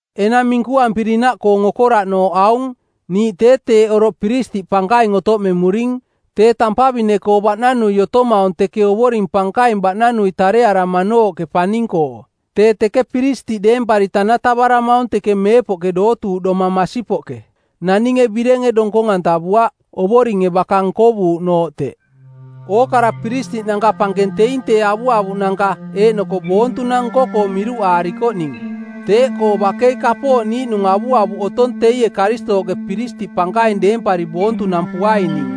Enang minkuampirinaꞌkoong okoraꞌnooꞌ aung: Niiꞌ tee teeꞌ oroꞌ piristiꞌ pankaing otoꞌmemuring, tee tampavine-koo baꞌnanui otomaung teke Ovoring Pankaing baꞌnanui tarearamanooꞌke paning-koo. Tee teke piristiꞌ deempari tanatavaramaung teke meepoꞌke dootuuꞌdoma masipoꞌke, naninge birenge donkong-antavuaꞌ, Ovoringe baka nkovuuꞌnooꞌ teꞌ. Ookara piristiꞌnanka pankeng teing tee avuavuꞌnanka eeꞌnoko boontunang nko-koo miruꞌaarikoꞌning, teeꞌkoo bakei kapooꞌ niiꞌnung avuavuꞌ otong teie Karistooꞌke piristiꞌ pankaing deempari boontunampuaining.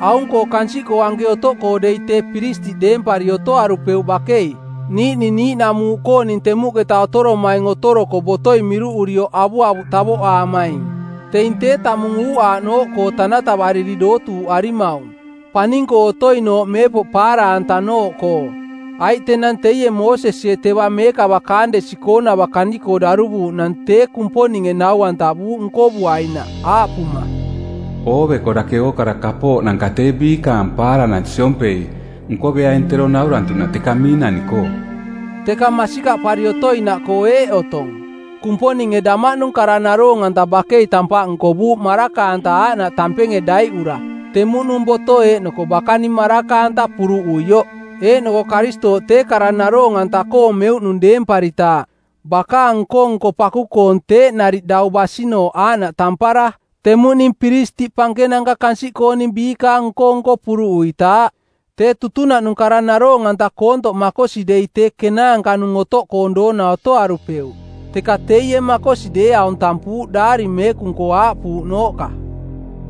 Aung-koo kansiꞌkoo anke otoꞌkoo dei tee piristiꞌ deempari otoarupeuꞌ bakei, niiꞌning niiꞌnamuuꞌkooning temuꞌketa otoromaing otoroko botoi miruꞌurioꞌ avuavuꞌ tavoꞌaamaing. Teing tee tamung uuꞌaaꞌnooꞌkoo tanatavari dootuuꞌarimaung, paning-koo otoinooꞌ meepoꞌ paara-antanooꞌkoo. Aiꞌ tenang teie Moosesie teva meekava kaandesi-koonava kani-koo daruvuuꞌnang tee Kumponinge nau-antavuuꞌ nkovuainaꞌ aaꞌpuma, “Ooveko dake ookara kapooꞌnanka tee biikaang paaranang siompei nkoveaing tero naurantuꞌnaꞌ teka miinani-koo.” Teka masikaꞌpari otoinaꞌkoo eeꞌ otong, Kumponinge damaꞌnung kara naroong-anta bakei tampaꞌ nkovuuꞌ maraka-anta aaꞌnaꞌ tampenge daiꞌura temuꞌnung boto eeꞌnoko bakaning maraka-anta puruꞌuioꞌ, eeꞌnoko Karistooꞌ tee kara naroong-anta-koong meuꞌnung deemparitaaꞌ bakaang nko-nko paku-koong teeꞌ nariꞌ dau basinooꞌ aaꞌnaꞌ tampara temuꞌning piristiꞌ pankenanka kansiꞌkooning biikaang nko-nko puruꞌuitaaꞌ. Tee tutunaꞌnung kara naroong-anta koontoꞌ makosi dei tee kenaanka-nung otoꞌkoong doona otoarupeuꞌ. Teka teie makosi deeaung tampuuꞌ Daari Meekung-koo aaꞌpuuꞌnooꞌka,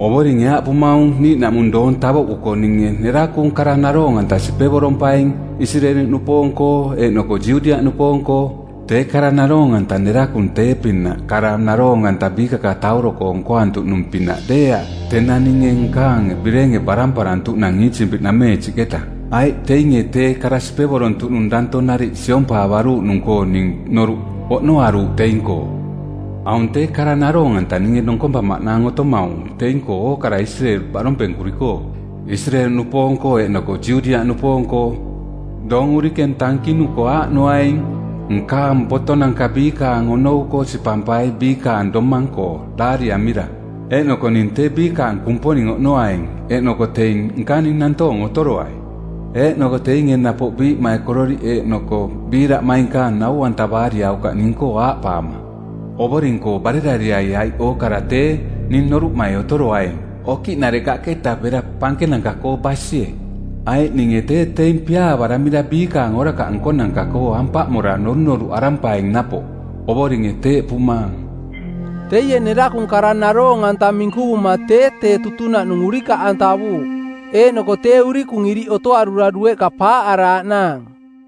“Ovoringe aaꞌpumaung: Niiꞌnaꞌmung doong tavoꞌkuko ninge nerakung kara naroong-anta sipevorompaing Isireeli-nupoong-koo eeꞌnoko Judiaꞌnupoong-koo. Tee kara naroong-anta nerakung tee-pinaꞌ kara naroong-anta biikakatauro-koo nkoantuꞌnung-pinaꞌ deeaꞌ tenang ninge nkaang birenge baramparantuꞌnang Iisipiꞌnameensiꞌketa, aiꞌ teinge tee kara sipevorontuꞌnung danto nariꞌ siompaavaruuꞌnung-koo ning noruꞌ oꞌnoaruuꞌ teing-koo. Aung tee kara naroong-anta ninge donkompamaꞌnaang otomaung teing-koo ookara Isireeli baꞌdompenkuri-koo, Isireeli-nupoong-koo eeꞌnoko Judiaꞌnupoong-koo, doong urikeng tankinuko, aaꞌnoaing, nkaang botonanka biikaang onou-koo sipampai biikaang domang-koo daariamira, eeꞌnoko ning tee biikaang Kumponing oꞌnoaing eeꞌnoko teing nkaning nantoong otoroai. Eeꞌnoko teinge napoꞌ biiꞌmaikororiꞌ eeꞌnoko biiraꞌmainkaang nau-antavaariaukaꞌ ning-koo aaꞌpaama, ‘Ovoring-koo barerariai,’ aiꞌ ookarai tee ning noruꞌmai otoroaing okiꞌnarekaꞌketa bera pankenanka-koo basie. Aiꞌ ninge tee teing piaavaramira biikaang orakaꞌ nkonanka-koo ampaꞌmora norunoruꞌarampaing napoꞌ. Ovoringe teeꞌpumaang.” Teie nerakung kara naroong-anta minkuvuma tee tee tutunaꞌnung urikaꞌantavuuꞌ. Eeꞌnoko tee urikung iriꞌ otoarura dueꞌka paaꞌaraaꞌnaang.